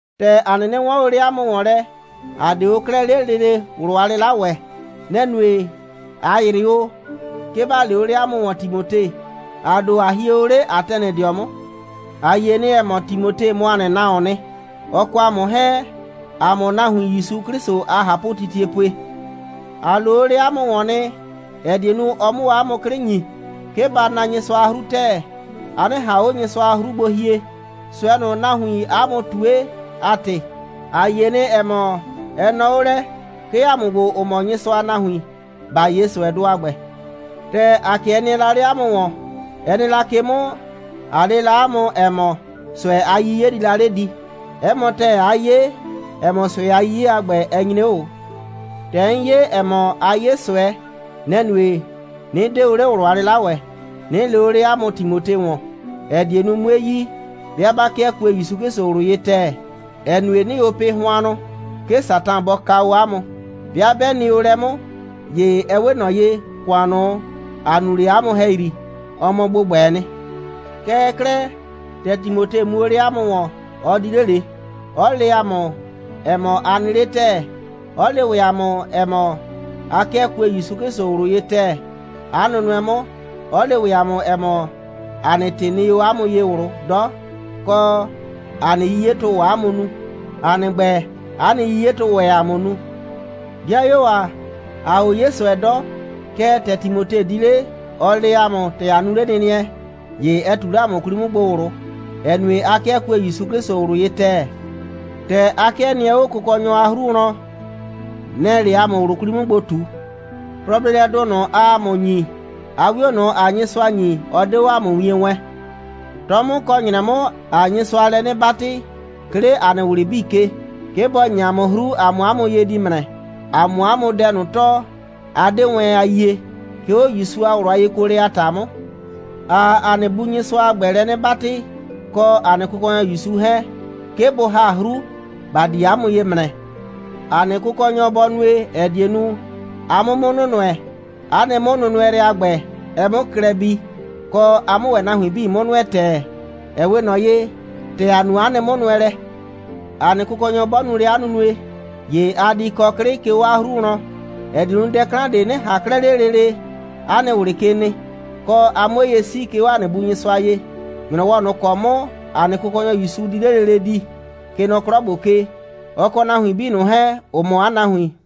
‑Tɛ ‑a 'nɩnɩ 'wɔɔn o 'le 'a mʋ ‑wɔn lɛ, ‑a 'de o 'klɛɛ 'le lele ꞊wlʋ a 'lɩla ‑wɛ. Nɛ‑ nue, ꞊a ‑yrɩ o, 'ke ‑ba lee o 'le 'a mʋ ‑wɔn Timote, ‑a ‑do, ꞊a hie o 'le Atɛnɩdɩɔ 'mʋ. A yie nɩ, ‑ɛ mɔ, Timote mɔ ‑a nɩ nahuoon nɩ, ɔ kɔ ‑a mʋ 'hɛɛn, ‑a mʋʋ nahuin ‑Yusu 'Klɩsʋ a ꞊hapʋtitie pue. ‑A loo o 'le 'a mʋ ‑wɔn nɩ, ‑ɛ die nu, ɔ 'mʋ 'a mʋ 'klɩ ‑nyi, 'ke ba na Nyɩsʋa a 'hru ‑tɛɛ, a 'nɩ ꞊han 'o Nyɩsʋa a 'hru gbo hie, ꞊sʋɛ ꞊nʋ, nahuiin 'a mʋ ꞊tue a ‑tɩ. ‑A yie nɩ, ‑ɛ mɔ, ɛ nɔɔ 'o lɛ, 'ke ‑a mʋ ‑gbo, ‑ʋ mɔ Nyɩsʋa a nahuin, ‑ba 'ye ꞊sʋɛdʋ a ‑gbɛ. ‑Tɛ ‑a 'kɩɛ nɩɛ la 'le 'a mʋ ‑wɔn, ɛ nɩ la ke 'mʋ, ꞊a le la 'a mʋ, ‑ɛ mɔ, ꞊sʋɛ a 'yiye di la 'le di. 'Ɛ mɔ ‑tɛɛ, 'a 'ye, ‑ɛ mɔ, ꞊sʋɛ a 'yiye a ‑gbɛ, ɛ nyre 'o ꞊o. ‑Tɛ 'n yie, ‑ɛ mɔ, aa 'ye ꞊sʋɛ, nɛ‑ nue, 'nɩ 'de o 'le ꞊wlʋ a 'lɩla ‑wɛ, 'nɩ lee o 'le 'a mʋ Timote ‑wɔn, ‑ɛ die nu, 'mue yi, 'bɩa 'ba 'kɩɛ kue ‑Yusu 'Klɩsʋ ꞊wlʋ ye ‑tɛɛ, ‑ɛ nue, 'nɩɩ o pɩ hʋannʋ, 'ke Satan bɔ kaa o 'a mʋ. 'Bɩa 'bɛ nɩ o lɛ 'mʋ, ‑ye ɛ 'we ꞊nɔ ye, ‑kʋan ꞊nʋ, ‑a nu la 'le 'a mʋ ‑hɛyri, ɔ mɔ ‑gbʋgbɛɛ nɩ. Kɛɛ 'klɛɛ, ‑tɛ Timote mu o 'le 'a mʋ ‑wɔn, ɔ di 'le ꞊le, 'ɔ le ‑a mʋ, ‑ɛ mɔ, a nɩ 'le ‑tɛɛ, 'ɔ le ‑wɛ ‑a mʋ, ‑ɛ mɔ, a 'kɩɛ kue ‑Yusu 'Klɩsʋ ꞊wlʋ ye ‑tɛɛ, 'a nʋnʋɛ 'mʋ, 'ɔ le ‑wɛ ‑a mʋ, ‑ɛ mɔ, ‑a nɩ ‑tɩ nɩ 'o 'a mʋ ye ꞊wlʋ 'dɔ, kɔ, ‑a nɩ 'yiyetʋ‑ʋ 'a mʋ nu. ‑A nɩ ‑gbɛ, 'a nɩ 'yiyetʋʋ ‑wɛ ‑a mʋ nu. 'Dɩayuo ‑a, ‑aa o 'ye ꞊sʋɛ 'dɔ, kɛɛ, ‑tɛ Timote di 'le, ɔ le ‑a mʋ, ‑tɛ a nu 'lenɩnɩɛ, ‑ye ɛ ꞊tu 'le ‑a mʋ 'kwli 'mʋ gbo ꞊wlʋ, ‑ɛ nue, a 'kɩɛ kue ‑Yusu 'Klɩsʋ ꞊wlʋ ye ‑tɛɛ. ‑Tɛ a 'kɩɛ nɩɛ 'o Kʋkɔnyɔ a 'hru wlɔn, nɛ‑ɛ 'le ‑a mʋ ꞊wlʋ 'kwli 'mʋ gbo ꞊tu. Plɔ a bleelɛdʋ ꞊nʋ, aa ‑a mʋ ‑nyi, 'a 'wio ꞊nʋ, ‑aa Nyɩsʋa ‑nyi, ɔ 'de 'o ‑a mʋ wien wɛɛn. 'Tɔ 'mʋ kɔ ‑nyrɛ 'mʋ, ‑aa Nyɩsʋa lɛ 'nɩ 'batɩ, 'ke 'le ‑a nɩ ꞊wlɩ 'bii ke, 'ke bɔ ‑nyi ‑a mʋ 'hru, ‑a 'mʋ 'a mʋ ye di ‑mrɛ, ‑a 'mʋ 'a mʋ dɛ ꞊nʋ tɔɔ, a 'de wɛn a yie, 'ke 'o ‑Yusu a ꞊wlʋ a yekuolɛ a ‑ta 'mʋ. ‑Aa ‑a nɩ Bu Nyɩsʋa a ‑gbɛ lɛ 'nɩ 'batɩ, kɔ ‑a nɩ Kʋkɔnyɔ ‑Yusu 'hɛɛn, 'ke bʋ ‑ha 'hru, ‑ba di 'a mʋ ye ‑mrɛ. ‑A nɩ Kʋkɔnyɔ bɔ nue, ‑ɛ die nu, a 'mʋ 'mʋ nʋnʋɛ, 'a nɩ 'mʋnʋnʋɛlɛ, a ‑gbɛ, ɛ 'mʋ klɛ bii, kɔ, a 'mʋ ‑wɛ nahuin 'bii 'mʋ nʋɛ ‑tɛɛ, ‑ɛ 'we ꞊nɔ ye, ‑tɛ ‑a nu 'a nɩ 'mʋnʋɛlɛ. ‑A nɩ Kʋkɔnyɔ 'bɔ nu lɛ 'a nunue, ‑ye a di kɔ 'klɩ, 'ke 'o 'a 'hru wlɔn, ‑ɛ die nu, dɛ 'klan ꞊de 'nɩ ꞊han 'klɛɛ 'le lele 'a nɩ ꞊wlɩ ke nɩ, kɔ, a 'mʋ 'o ye 'sii, 'ke 'o ‑a nɩ Bu Nyɩsʋa ye, ‑nyrɔwɔ ꞊nʋ ‑kɔ 'mʋ ‑a nɩ Kʋkɔnyɔ ‑Yusu di 'le lele di, kɛ nɔ 'klɔ ‑gbo ke, ɔ kɔ nahuin 'bii ꞊nʋ 'hɛɛn, ‑ʋ mɔ 'a nahuin.